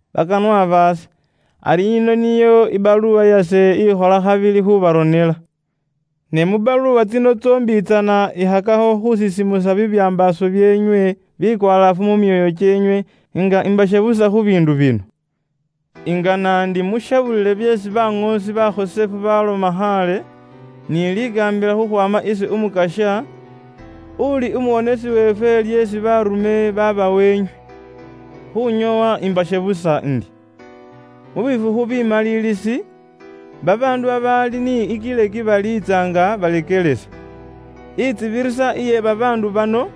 Bakanwa baase, ari yino niyo ibaluwa yase ikhola khabili khuubaronela. Ne mu baluwa tsino tsombitsana ikhakakho khuusisimusa bibyambaaso byeenywe bikwalaafu mu myoyo kyeenywe, nga imbashebusa khu biindu bino. Ingana ndi mushebulile byeesi baŋoosi bakhosefu baaloma khaale, ni likaambila khukhwaama isi Umukasya, uli umuwonesi weefwe lyeesi baarume baabawa inywe. Khuunyoowa imbashebusa indi, mu bifukhu bimaliilisi babaandu babaali ni ikileki baliitsa nga baleekelesa. Intsibirisa iye babaandu bano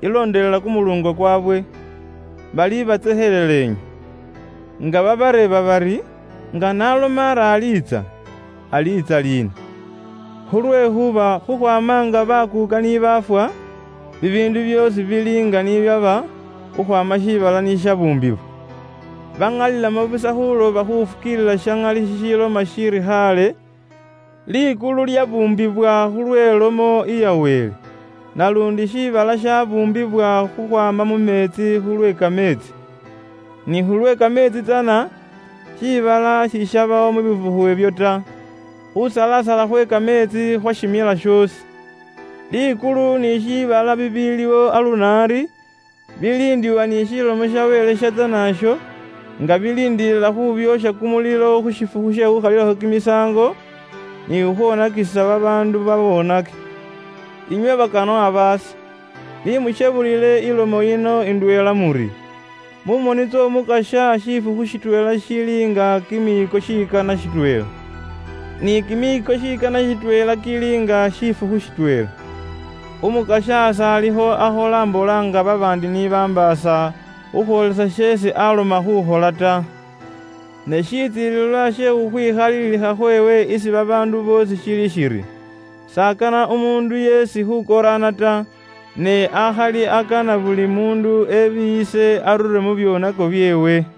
ilondelela kumuluungo kwaabwe. Balibatsekhelela inywe nga babareeba bari, “Nga n'aloma ari aliitsa, aliitsa liina? Khulwekhuuba khukhwaama nga bakuuka ni baafwa, bibiindu byoosi bili nga ni byaba khukhwaama shiibala ni shibuumbibwa.” Baŋalilamo busa khuuloba khufukiilila sha ŋali shishiloma shiri khaale, likulu lyabuumbibwa khulwe lomo iya Wele. Naluundi shiibala shabuumbibwa khukhwaama mu meetsi khulwe kameetsi. Ni khulwe kameetsi tsana, shiibala sishabawo mu bifukhu ibyo ta. Khusalasala khwe kameetsi khwashimila shoosi. Likulu ni shiibala bibiiliwo aluno ari, biliindibwa ni Lomo ya Wele iyatsana iyo, nga biliindilila khuubyoosha kumulilo khu shifukhu she khuukhalilakho kimisaango, ni khukhwoonakisa babaandu baboonaki. Inywe bakanwa baase, ni mushebulile ilomo yino indweela muri, mu moni ts'Omukasya shifukhu shitweela shili nga kimiiko shikana shitweela. Ni kimiiko shikana shitweela kili nga shifukhu shitweela. Umukasya s'alikho akhola mbola nga babaandi ni bambaasa, khukhwoolelesa sheesi aaloma khuukhola ta. Ne shitsilililwa she khukhwikhaliilikha khweewe isi babaandu boosi shili shiri, s'akana umuundu yeesi khuukoraana ta. Ne akhali akana buli muundu ebiiyise arure mu byoonako byeewe.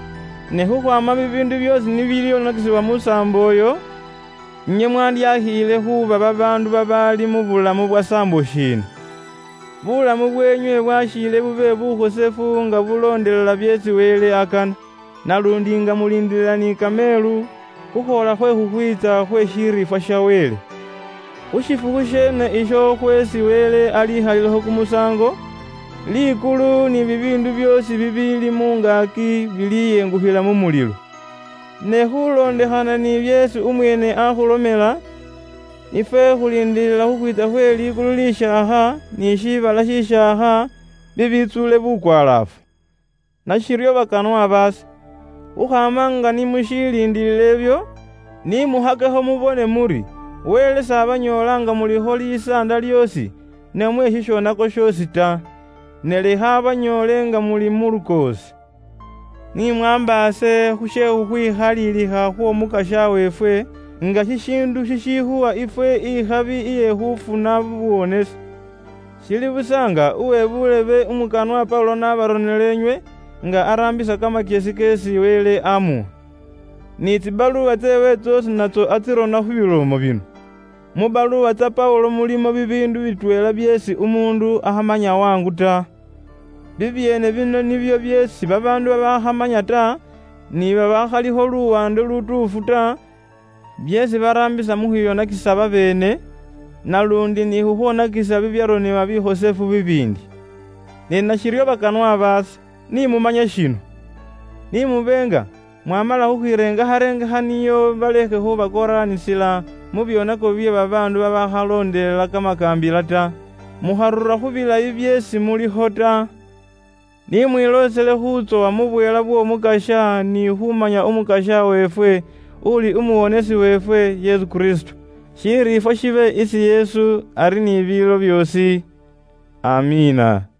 Ne khukhwaama bibiindu byoosi ni bilyonakisibwa mu saambo iyo, inywe mwandyakhiile khuuba babaandu babaali mu bulamu bwa saambo shiina? Buulamu bweenywe bwakhiile bube bukhosefu nga bulondelela byeesi Wele akana. Naluundi nga muliindilila ni kameelu khukhwoola khwe khukhwiitsa khwe shiriifwa sha Wele. Khu shifukhu sheene isho khweesi Wele alikhalilakho kumusaango, likulu ni bibiindu byoosi bibiili mu ngaaki biliyengukhila mu mulilo. Ne khuulondekhana ni byeesi umweene aakhulomela, ifwe khuliindiilila khukhwiitsa khwe likulu lishaakha, ni shiibala shishaakha, bibiitsuule bukwalaafu. Nashiryo bakanwa baase, khukhwaama nga ni mushiliindiilila ibyo, ni mukhakekho mubone muri Wele s'abanyoola nga mulikho likoondo lyoosi namwe shishoonako shoosi ta. Ne lekha abanyoole nga muli mu lukoosi. Ni mwaambaase khu she khukhwikhalilikha khw'Omukasya weefwe, nga shishiindu shishikhuwa ifwe ikhabi iye khuufuna buuwonesi. Shili busa nga uwe buulebe umukanwa Paulo n'abaronela inywe, nga araambisa kamakyesi keesi Wele aamuwa. Ni tsibaluwa tseewe tsoosi natso aarona khu bilomo bino. Mu baluwa tsa Paulo mulimo bibiindu bitweela byeesi umuundu akhamanya waangu ta. Bibyeene bino nibyo byeesi babaandu babaakhamanya ta, ni babaakhalikho luwaande lutuufu ta, byeesi baraambisa mu khwiyonakisa babeene, naluundi ni khukhwonakisa bibyaronebwa bikhosefu bibiindi. Ne nashiryo bakanwa baase, ni mumanye shino: ni mube nga mwaamala khukhwirengarengekha nio balekhe khubakoraanisila mu byoonako bye babaandu babaali ni tsisaambo tsiimbi ta. Mukharura khu bilayi byeesi mulikho ta. Ni mwiloosele khuutsowa mu bweela bw'Omukasya ni mu khumanya Umukasya weefwe, uuli umuwonesi weefwe, Yesu Kristo. Shiriifwa shibe isi Yesu ari ni biilo byoosi. Amiina.